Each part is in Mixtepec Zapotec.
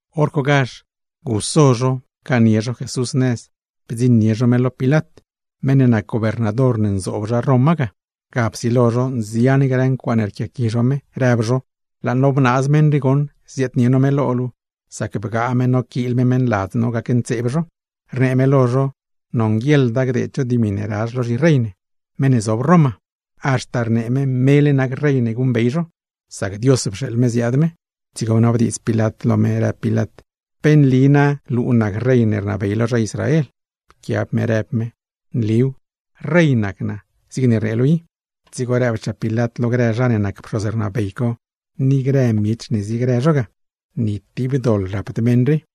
Horcogazh pcaanie zho Jesús nëz, bdziṉnie zho me lo Pilat, meṉ ne nac gobernador ne nzoob zha Roma ga. Ga psilo zho nzian grë ncuaaṉe rquiaqui zho me, rëb zho: ―Laa no bnaaz meṉ rii goṉ ziaadnie no me lo luu, sac bgaa me noquiil me meṉladz no gacntseeb zho. Rnee me lo zho nonguieḻda gdeed zho dimi ne razh lo zhirey ne, meṉ ne zob Roma; haxta rnee me mele nac rey ne guṉbey zho, sac Dios pxeeḻ me ziaad me. Dzigo bnabdiidz Pilat lo me, rëb Pilat: ―¿Pe nli na luu nac Rey ne rnabey lo zha Israel? Pquiab me rëb me: ―Nliw, rey nac naa zigne rnee luu i. Dzigo rëbchaa Pilat lo grë zha ne ne nac pxoz rnabey co, ni grë miech ne ziegrë zho ga: ―¡Ni tib doḻ rapd meṉ rii!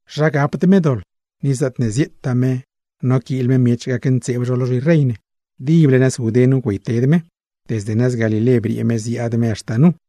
―¿Zha gapd me doḻ? ―rëb zho―. Ni zaatne zieetaa me noquiil me miech gacntseeb zho lo zhirey ne. ¡Dible nëz Judé nu güeyted me; desde nëz Galilé briee me ziaad me haxta nu!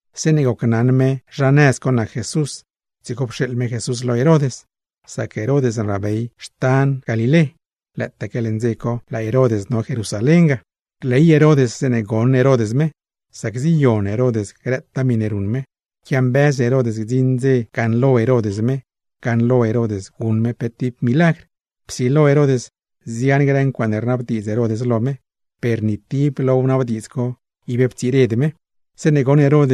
Zeeṉe gocnaṉ me zha nëz co nac Jesús, dzigo pxeeḻ me Jesús lo Herod, sac Herod rnabey nëz Galilé; lëëtaque leṉ dze co laa Herod no Jerusalén ga. Rley Herod zeeṉe goṉ Herod me, sac ziyon Herod grëtaa miṉe ruṉ me; quiambëz Herod gdziṉ dze gaṉlo Herod me, gaṉlo Herod guṉ me pe tib milagr. Psilo Herod nzian grë ncuaaṉe rnabdiidz Herod lo me, per ni tib lo wnabdiidz co ib ptsired me. Zeeṉe goṉ Herod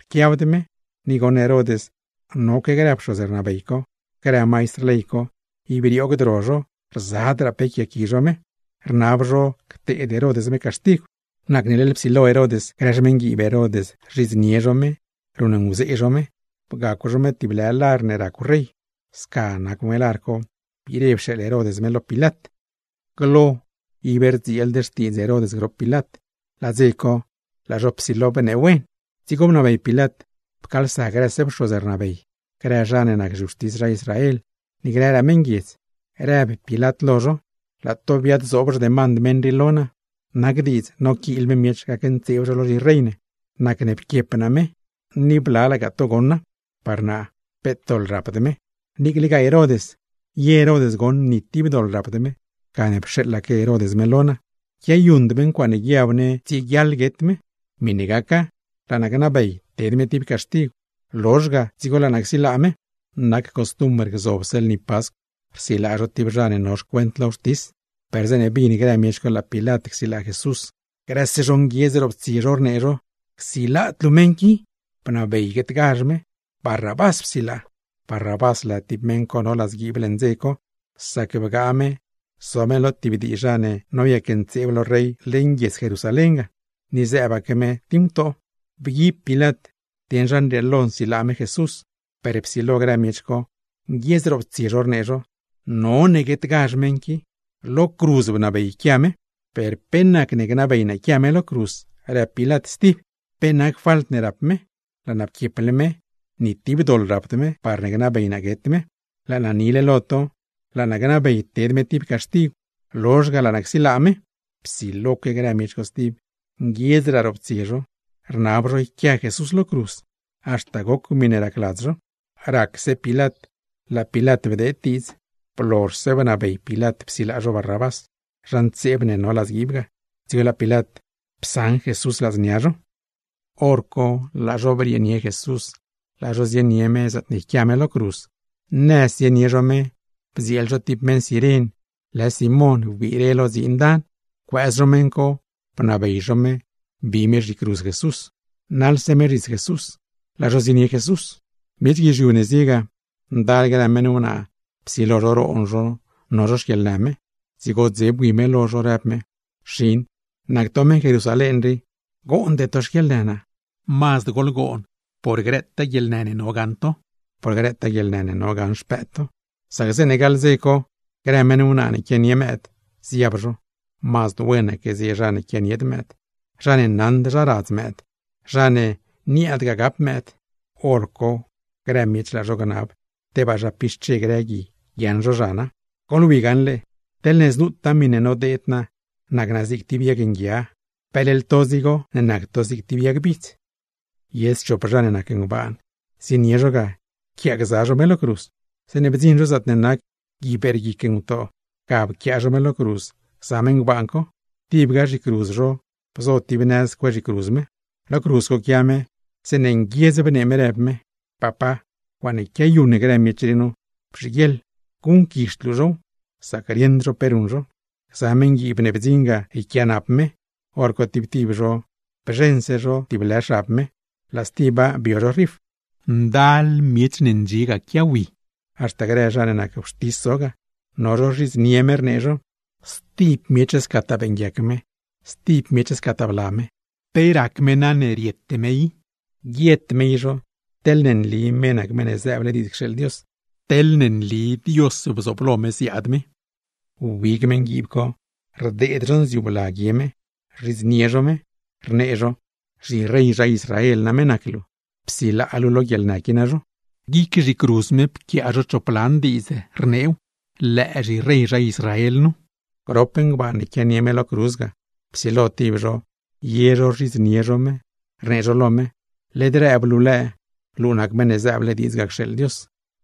rquiabd me, ni goṉ Herod noque grë pxoz rnabey co, grë maistr ley co, ib rioogd ro zho rzadraa pe yquiaaqui zho me, rnab zho cteed Herod me caxtigw, nacne leḻ psilo Herod grë xmeṉguiib Herod rzhidznie zho me, ruṉnguzee zho me. Bgacw zho me tib lar ne racw rey, sca nacw me lar co biire pxeeḻ Herod me lo Pilat. Glo ib rdzieeld xtiidz Herod grop Pilat, laa dze co laa zho psilo bneewen stib. Dzigo bnabey Pilat pcaalsa grëse pxoz rnabey, grë zha ne nac zhiwxtis zha Israel, ni grëraa meṉguiedz, rëb Pilat lo zho: ―Laa zho biad-zoob xdemand meṉ rii lo naa nu, nac diidz noquiil me miech gacntseeb zho lo zhirey ne. Nacne pquiep naa me, ni blalagaa to goṉa; par naa peet doḻ rapd me. Niiclegaa Herod, ye Herod goṉ ni tib doḻ rapd me; gane pxeeḻaque Herod me lo naa. Quiayuṉd me ncuaaṉe guiab ne rieguiaḻ guet me. Miṉe gaca, laa naa gnabey ted me tib caxtigw, lozh ga dzigo laa naa csilaa me. Nac costumbr, gzobse lni Pascw rsilaa zho tib zha ne no xcuent lo wxtis. Per zeeṉe bin grë miech co laa Pilat csilaa Jesús, grëse zho nguiedz roptsie zho, rnee zho: ―¡Csilaad luu meṉ qui, bnabey guetgazh me! ¡Barrabás psilaa! Barrabás lë tib meṉ co no ladzguiib leṉ dze co, sac bgaa me zo me lo tib dii zha ne noyacntseeb lo rey leṉ guiedz Jerusalén ga, ni zëëbaque me tib ngutoo. Bguib Pilat dieṉ zha nrieelo nsilaa me Jesús, per psilo grë miech co nguiedz roptsie zho, rnee zho: ―¡None guetgazh meṉ qui! ¡Lo cruz bnabey yquia me! ―Per, ¿pe nacne gnabey naa yquia me lo cruz? ―rëb Pilat stib―. ¿Pe nac falt ne rap me? Laa naa pquieple me, ni tib doḻ rapd me, parne gnabey naa guet me. Laa naa nile lo to, laa naa gnabey ted me tib caxtigw, lozh ga laa naa csilaa me. Psiloque grë miech co stib, nguiedzraa roptsie zho, rnab zho yquia Jesús lo cruz; haxta goc miṉe racladz zho. Racse Pilat, laa Pilat bdeed diidz. Blozhse bnabey Pilat psilaa zho Barrabás, zha ntseeb ne no ladzguiib ga, dzigo laa Pilat psaṉ Jesús ladznia zho. Horco laa zho brieenie Jesús laa zho zienie me zaatne yquia me lo cruz. Nëz zienie zho me, bdzieel zho tib meṉ Ciren lë Simón wbire lo dziin dan, pcuëëz zho meṉ co, bnabey zho me bi me zhicruz Jesús; naḻse me zhits Jesús, laa zho zienie Jesús. Miech guizhiu ne zie ga, ndal grë meṉ wnaa psilo zho roon zho no zho xquieḻnë me, dzigo dze bui me lo zho, rëb me: ―Xin, nac to meṉ Jerusalén rii, goonde to xquieḻnë naa. Mazd goḻgoon por grëtaa guieḻnë ne no gaṉ to, por grëtaa guieḻnë ne no gaṉ xpëëd to; sac zeeṉe gaḻ dze co grë meṉ wnaa ne quianie mëëd, ziab zho: “Mazd wenaque zie zha ne quianied mëëd, zha ne naṉd zha radz mëëd, zha ne niaadgaa gap mëëd.” Horco grë miech, laa zho gnab tebaa zha pixche grë gui guiaaṉ zho zhana. ¡Goḻwi gaṉle, teḻne znutaa miṉe nodeed naa nac naa zig tib yag nguia, peleḻ to dzigo ne nac to zig tib yag bidz! Ye schop zha ne nac ngbaan, zienie zho ga yquiaagza zho me lo cruz. Zeeṉe bdziṉ zho zaatne nac “Gui Beerguic Ngutoo”, ga pquiaa zho me lo cruz gza me ngbaan co. Tibga zhicruz zho bzo tib nëz cue zhicruz me. Lo cruz co quia me, zeeṉe nguiedz bnee me rëb me: ―¡Papá! Ncuaaṉe quiayuṉ grë miech rii nu, bzhiguieḻ guṉquizhd luu zhow; sac rieṉd zho pe ruṉ zho. Gza meṉguiib ne bdziṉ ga yquiaanap me, hor co tib tib zho bzheṉse zho tib lë xab me, laa stiba bio zho rif. Ndal miech ne ndxie quiawi. Haxta grë zha ne nac wxtis zo ga, no zho rzhidznie zho me, rnee zho: ―Stib miech scataa beeṉguiac me, stib miech scataa bla me. ¿Pe rac me na ne riete me i? ¡Guiet me i zho, teḻne nli me nac Meṉ ne zëëble diidz cxeeḻ Dios, teḻne nli Dios bzooblo me ziaad me! Wbig meṉguiib co rdeed zho nziu bla guie me, rzhidznie zho me, rnee zho: ―¡Zhirey zha Israel name nac luu! Psilaa luu lo guieḻnë qui nazho. Glaa guic zhicruz me quia choplan diidz ne pquiaa zho, rneew: “LËË ZHIREY ZHA ISRAEL NU.” Grop ngbaan ne quianie me lo cruz ga, psilo tib zho ye zho rzhidznie me, rnee zho lo me: ―¡Led rëb luu lëë, luu nac Meṉ ne zëëble diidz ga cxeeḻ Dios!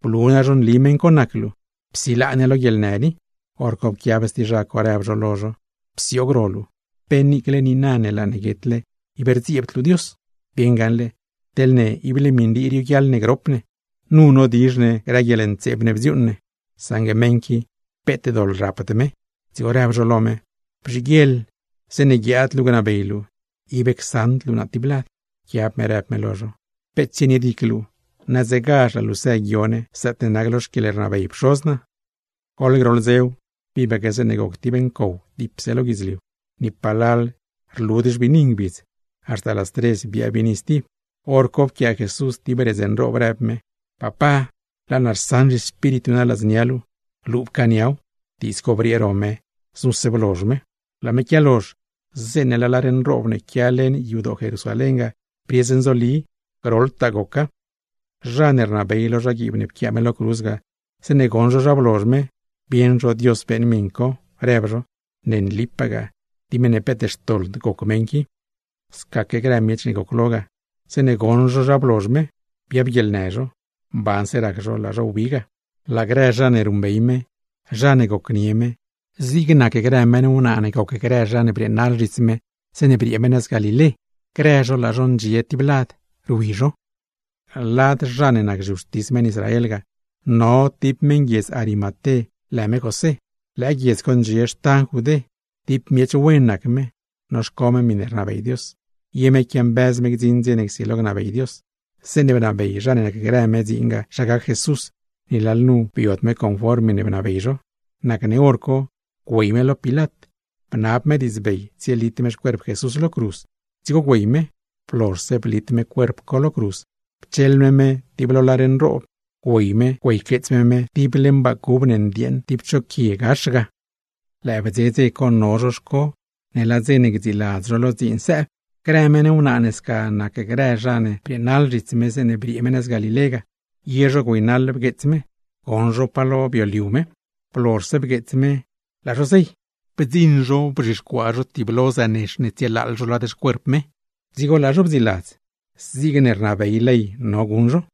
¡Blu nazho nli meṉ co nac luu, psilaa ne lo guieḻnë rii! Horco pquiab stib zha co, rëb zho lo zho: ―¡Psioog ro luu! ¿Pe niicle niina ne laa luu guetle ib rdzieebd luu Dios? Bieṉ gaṉle, ¡teḻ ne ible miṉ rii rioguiaḻ ne grop ne, nu nodizh ne grë guieḻntseeb ne bdziuuṉ ne; saṉgue meṉ qui, peet doḻ rapd me! Dzigo rëb zho lo me: ―¡Bzhiguieḻ zeeṉe guiaad luu gnabey luu, ib csaṉd luu naa tib lad! Pquiab me rëb me lo zho: ―Peet tsienied guic luu, nadzegazh laa luu së guioo ne zaatne nac lo xquieḻbley Pxoz naa. Goḻ groḻ dzew, tibaque zeeṉe goc tib ncow dipse lo guidzliu. Ni palal rlud xbiini ngbidz, haxta las tres biaa biini stib. Horco pquiaa Jesús tib redz nroob, rëb me: ―Papá, laa naa rsaṉ zhiespíritu naa ladznia luu, luu pcaaniaw. Diidz co briee ro me, znuse blozh me. Laa me quialozh, zeeṉe laa lar nroob ne quia leṉ yadoo Jerusalén ga briez nzoli, groḻtaa goca. Zha ne rnabey lo zhaguiib ne pquiaa me lo cruz ga, zeeṉe goṉ zho zha blozh me, bieṉ zho Dios beeṉ miṉ co, rëb zho: ―¡Ne nlipagaa tib meṉ peet xtoḻd goc meṉ qui! Scaque grë miech ne goclo ga, zeeṉe goṉ zho zha blozh me, biabguieḻnë zho, mbanse rac zho laa zho wbi ga. Laa grë zha ne ruṉbey me, zha ne gocnie me, zig nac grë meṉ wnaa ne gocgrë zha ne brieenaḻ zhits me zeeṉe briee me nëz Galilé, grë zho laa zho ndxiese tib lad rwi zho. Lad grë zha ne nac zhiwxtis meṉ Israel ga, no tib meṉ guiedz Arimaté lë me José; lëë guiedz co ndxie xtan Judé. Tib miech wen nac me, noxco me miṉe rnabey Dios, ye me quiambëz gdziṉ dze ne csilo gnabey Dios. Zeeṉe bnabey zha ne nacgrë me dziin ga zha gac Jesús, ni lalnu biod me conform miṉe bnabey zho. Nacne hor co güey me lo Pilat, bnab me diidzbey tsielit me xcuerp Jesús lo cruz. Dzigo güey me, blozhse blit me cuerp co lo cruz, pcheḻ me me tib lo lar nroob, güey me güeyqueets me me tib leṉ baa cub ndieeṉ tib cho quie gax ga. Lëë bdze dze co no zho xco ne laa dze ne gdziiladz zho lo dziin sëëb. Grë meṉ wnaa ne sca nacgza grë zha ne brieenaḻ zhits me zeeṉe briee me nëz Galilé ga, ye zho güeynaḻ bgueets me, goṉ zho pa lo bio me. Blozhse bgueets me, laa zho zey. Bdziṉ zho bzhixcuaa zho, tiblo zënex ne tsietëëb zho lad xcuerp me; dzigo laa zho bdziiladz zigne rnabey ley no guṉ zho.